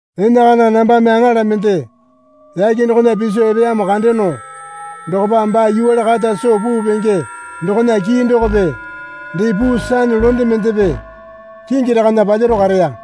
Enakana nambame aŋala mende yake dokona piso epeyamo kandeyono dokopa baa yuwale kata soo puu penge dokona kii dokope dee puu sane londe mendepe kingi rakana palyaro kareya.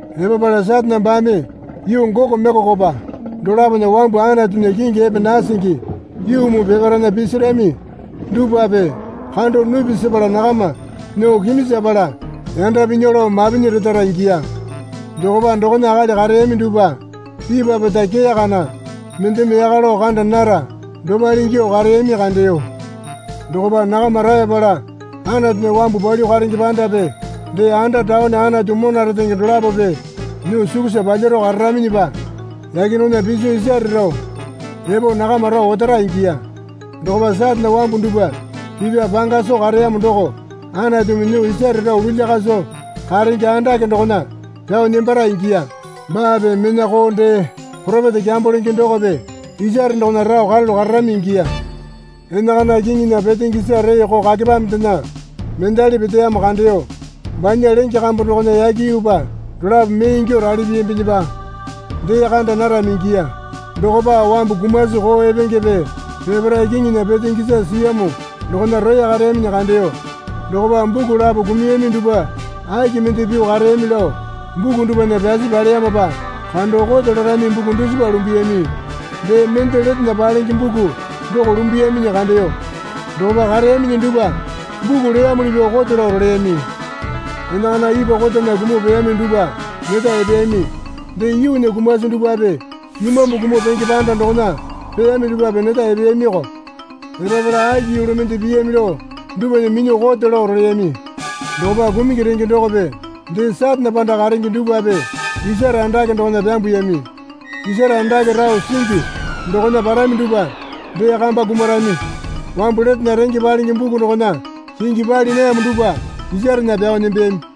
Epapala Satane baame yuu Goko Mekokopa dolapona wambu Anatunya kingi epe nasingi yuu muu peparaena pisirami dupwape kando nupi sepala nakama nyuo kiminjapala yanda pinya lao mapinyi retara ingiya. Dokopa dokona akali kareyami dupwa ipwa pota kee kana mendeme yaka lao kanda nara dopale ingyuo kareyami kandeyo. Dokopa nakama raeyapala Anatunya wambu palyuo karenge pandape dee anda taone Anatu mona retenge dolapope nyuo sukusa palyaro kararaminyipa yake dokona piso isare rao epo nakama rao otara ingiya. Dokopa Satane wambu dupwa pipa panga soo kareyamo doko Anatumi nyuo isare rao lulya kaso karenge andake dokona pyao nembara ingiya. Baape mena koo dee poropeta kyambo lenge dokope isare dokona rao karalu kararami ingiya. Enakana kiŋinya petenge isa reeko kakepamendena mendali peteyamo kandeyo. Banya lenge kambu dokona yake yuupa dolapo mee ingyuo rali piyambinyipa dee kanda narami ingiya. Dokopa wambu kumasi koo epengepe peparae kiŋinya petenge isa siyamo dokona roya kareyaminyi kandeyo. Dokopa buku lapo kumuyami dupwa aki mende pyuo kareyami lao buku dupwana pyasi paleyamopa kando kote larami buku dusipa lumbuyami. Dee mende letena palenge buku doko lumbuyaminyi kandeyo. Dokopa kareyaminyi dupwa buku leyamuli pyuo kote lao roleyami. Enakana ipwa kotana kumuo peyami dupwa neta epeyami. Dee yuunya kumasi dupwape imambu kumuo penge panda dokona peyami dupwape neta epeyamiyoko. Epapala aki yulu mende piyami lao dupwana minyuo kote lao roleyami. Dokopa kumungi renge dokope dee Satane panda karenge dupwape isare andake dokona pyambuyami. (Isare andake rao singi dokona parami dupwa dee kamba kumarami.) Wambu letena renge palenge buku dokona kingi pali nayamo dupwa isarena pyao nembeyami.